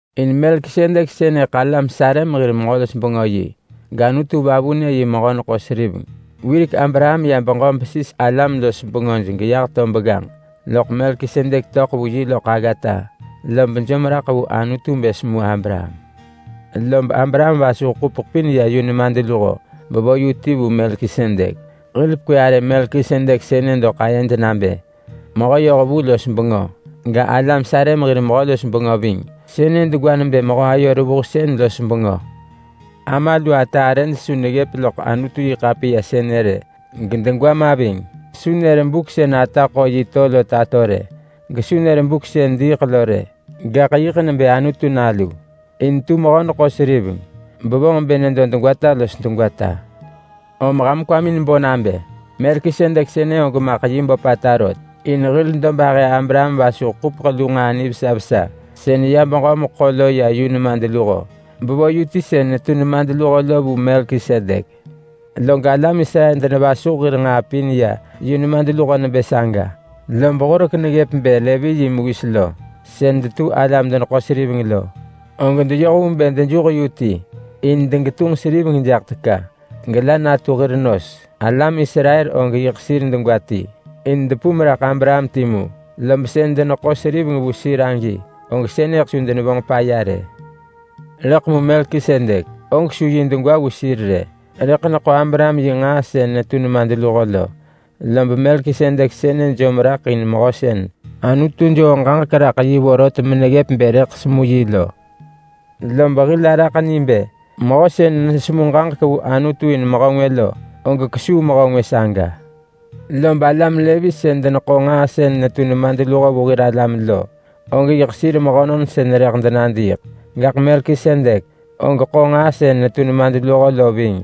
In Melkisedek sënëḳ alam Salem hir Mehö-los-bengö yi, gAnutu vavunë yi mehö-neḳo-seriveng. Wirek Abraham ya beġö besis alam-los-bengöj geyah to begganġ, loḳ Melkisedek töḳ vu yi loḳ aggata lob jom raḳ vu Anutu bë semu Abraham. Lob Abraham vasuh ḳupeḳ pin ya yu nemadluho bevo yu ti vu Melkisedek. Hil pekwë arë Melkisedek sënë doḳ ayed nabë ‘mehö-yohvu-los-bengö’ ga, ‘alam Salem hir mehö-los-bengö’ ving. Sënë degwa nebë ‘mehö-ayo-revuhsën-los-bengö’. Ama lu ata arëj su neggëp loḳ Anutu-yi-ḳapiya sënë rë, gedegwa ma ving. Su nër buk sën ata ḳo yi to lo tato rë, gesu nër buk sën diiḳ lo rë, gaḳ yiḳ nebë Anutu Nalu in tu mehö-neḳo-seriveng bevonġ bë nedo degwata los degwata. Om ham kwamin bo nabë: Melkisedek sënë og maḳ yi böpata rot, in hil dobahë Abraham vasuh ḳupeḳ lu nġaa nivesa vesa sën ya beġö meḳo lo ya yu nemadluho, bevo yu ti sën netu nemadluho lo vu Melkisedek. Log alam Israel denevasuh hir nġaa pin ya yu nemadluho nebë saga, lob horek neggëp bë Levi yi mewis lo, sën detu alam-deneḳo-seriveng lo, og deyoh vu bë dejuh yu ti in degetunġ seriveng jaḳ teka gela natu hir nos. Alam Israel og yiḳ sir degwa ti in depum raḳ Abraham timu, lob sën deneḳo seriveng vu sir agi, og sënëḳ su denevonġ paya rë. Rëḳ mu Melkisedek, og su yi degwa vu sir rë, rëḳ neḳo Abraham yi nġaa sën netu nemadluho lo. Lob Melkisedek sënë jom raḳ in mehö sën Anutu joo ġaġek vorot meneggëp vu yi bë rëḳ semu yi lo. Lob hil araḳ ni bë mehö sën nesemu ġaġek vu Anutu in mehö ngwë lo, og kesuu mehö ngwë saga. Lob alam Levi sën deneḳo nġaa sën netu nemadluho vu hir alam lo, og yiḳ sir mehönon sën rëḳ denadiiḳ. Gaḳ Melkisedek, og ḳo nġaa sën netu nemadluho lo ving,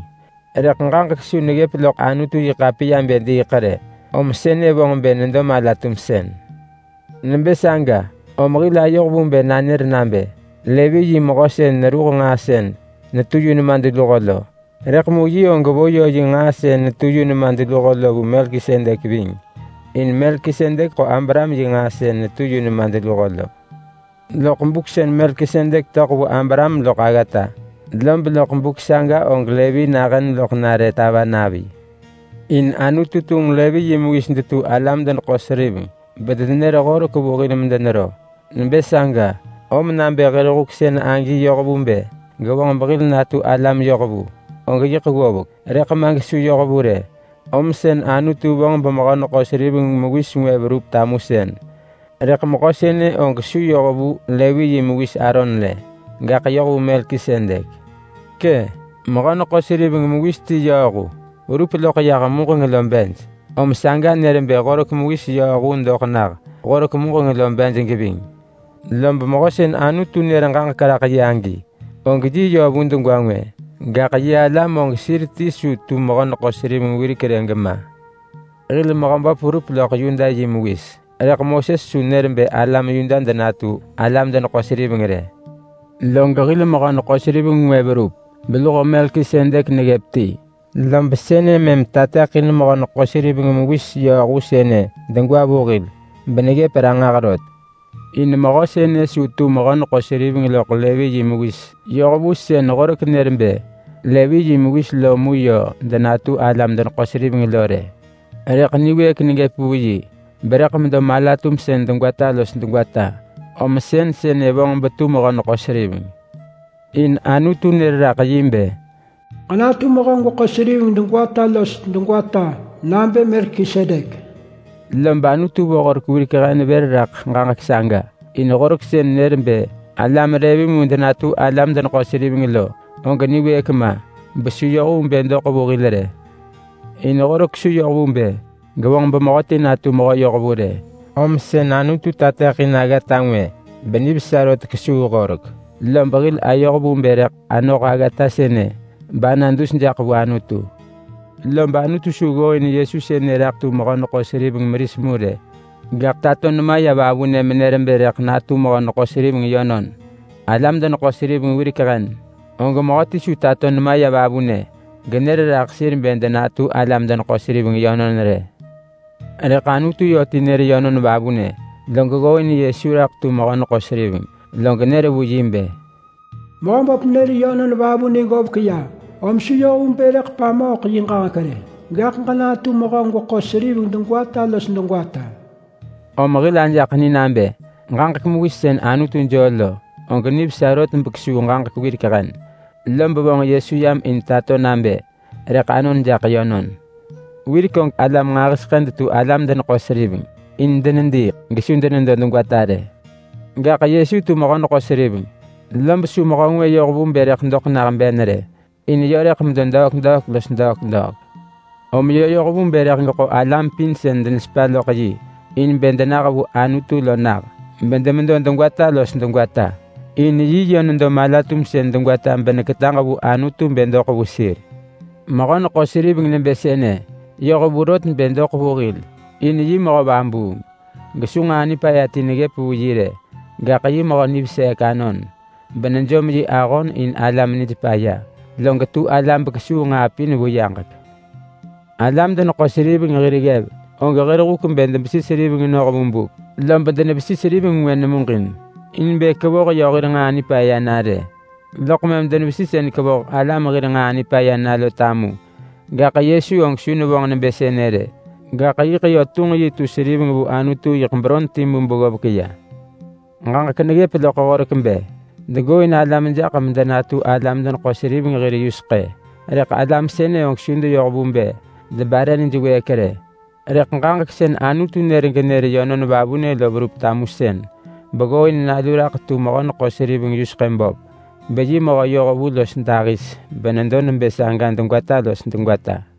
rëḳ ġaġek su neggëp loḳ Anutu-yi-ḳapiya bë diiḳ rë, om sënë vonġ bë nedo mala-tumsën. Nebë saga, om hil ayoh vu bë nanër nabë: Levi yi mehö sën neruh nġaa sën netu yu nemadluho lo, rëḳ mu yi og vo yö yi nġaa sën netu yu nemadluho lo vu Melkisedek ving. In Melkisedek ḳo Abraham yi nġaa sën netu yu nemadluho lo loḳ buk sën Melkisedek töḳ vu Abraham loḳ aggata. Lob loḳ buk saga og Levi nahën loḳ nare tava navi. In Anutu tunġ Levi yi mewis detu alam-deneḳo-seriveng bedenenër Horek vu hil medenero. Nebë saga, om nabë hir huk sën agi yoh vu bë gevonġ behil natu alam yohvu, og yiḳ ggovek. Rëḳ ma gesu yoh vu rë, om sën Anutu vonġ bemehö-neḳo-seriveng mewis ngwë verup tamusën. Rëḳ mehö sënë og su yoh vu Levi yi mewis Aaron rë, gaḳ yoh vu Melkisedek. Kë, mehö-neḳo-seriveng mewis ti yööhu verup loḳ yah muġeng lo bej, om saga nër bë Horek mewis yööhu doḳ nah horek muġeng lo bej geving. Lob Mehö sën Anutu nër ġaġek raḳ yi agi, og yi yö vu degwa ngwë, gaḳ yi alam og sir ti su tu mehö-neḳo-seriveng wirek rë gema. In hil araḳ ni bë hil Mehöböp verup loḳ Yuda yi mewis, rëḳ Moses su nër bë alam Yuda denatu alam-deneḳo-seriveng rë. Log hil mehö-neḳo-seriveng ngwë verup, beluho Melkisedek neggëp ti. Lob sënë mëm tateḳin mehö-neḳo-seriveng mewis yööhu sënë degwa vu hil beneggëp ranġah rot. In mehö sënë su tu mehö-neḳo-seriveng loḳ Levi yi mewis yoh vu horek sën deneggooin Levi yi mewis mu raḳ medenetu alam-deneḳo-seriveng lo rë. Rëḳ niwëëk neggëp vu yi berëḳ medo mala-tumsën degwata los degwata, om sën sënë vonġ betu mehö-neḳo-seriveng. In Anutu nër raḳ yi bë: “Ġenatu mehö-gweko-seriveng degwata los degwata noh vu Melkisedek.” Lob Anutu vo Horek wirek hen vër raḳ ġaġek saga. In Horek sën nër bë alam Levi mu denatu alam-deneḳo-seriveng lo, og niwëëk ma besu yoh vu bë doḳ vu hil rë. In Horek su yoh vu bë gevonġ bemehöti natu mehö yohvu rë. Om sën Anutu tateḳin aggata ngwë benivesa rot kesuu Horek. Lob hil ayoh vu bë rëḳ anoh aggata sënë bana dus jaḳ vu Anutu. Lob Anutu su ggooin Yesu sënë raḳ tu mehö-neḳo-seriveng meris mu rë, gaḳ tato nema ya vavunë menër bë rëḳ natu mehö-neḳo-seriveng yönon. Alam-deneḳo-seriveng wirek hen, og mehöti su tato nema ya vavunë menër raḳ sir bë denatu alam-deneḳo-seriveng yönon rë. Rëḳ Anutu yö ti nër yönon vavunë, log ggooin Yesu raḳ tu mehö-neḳo-seriveng, log nër vu yi bë: “Mehöböp nër yönon vavunë ggovek ya, om su yoh vu bë rëḳ pamooḳ yi ġaġek rë. Gaḳ ġenatu mehö-neḳo-seriveng degwata los degwata.” Om hil ajaḳ ni nabë ġaġek mewis sën Anutu joo lo, og nivesa rot bekesuu ġaġek wirek hen, lob vonġ Yesu yam in tato nabë rëḳ anon jaḳ yönon. Wirek og alam nġahiseḳë detu alam-deneḳo-seriveng. In denediiḳ gesu denedo degwata rë. Gaḳ Yesu tu mehö-neḳo-seriveng, lob su mehö ngwë yoh vu bë rëḳ doḳ nah ben rë, in yö rëḳ medo degwata los degwata. Om yö yoh vu bë rëḳ geḳo alam pin sën denesepa loḳ yi in bë denah vu Anutu lo nah, bedemedo degwata los degwata. In yi yö nedo mala-tumsën degwata beneketaġ vu Anutu bë doḳ vu sir. Mehö-neḳo-seriveng nebë sënë yoh vu rot bë doḳ vu hil, in yi mehö vabuung gesu nġaa nipaya ti neggëp vu yi rë. Gaḳ yi mehö niveseek anon, benejom yi ahon in alam nij paya. Log tu ala bekesuu nġaa pin vu yaġek. Alam-deneḳo-seriveng hir ggev og hir huk bë debesi seriveng noh vu buk. Lob denevesi seriveng ngwë muġin in bë kevoh yö hir nġaa nipaya na rë, loḳ mëm denevesi sën kevoh alam hir nġaa nipaya na lo tamu. Gaḳ Yesu og su nevonġ nebë sënë rë. Gaḳ yiḳ yö tunġ yi tu seriveng vu Anutu yiḳ beron timu beggovek ya. Ġaġek neggëp loḳ Horek bë degooin alam jaḳ medenatu alam-deneḳo-seriveng hir yuseḳë, rëḳ alam sënë og su deyoh vu bë debare nij wëëk rë. Rëḳ ġaġek sën Anutu nër genër yönon vavunë lo verup tamusën beggooin Nalu raḳ tu mehö-neḳo-seriveng yuseḳë böp, beyi mehö yohvu los dahis benedo nebë saga degwata los degwata.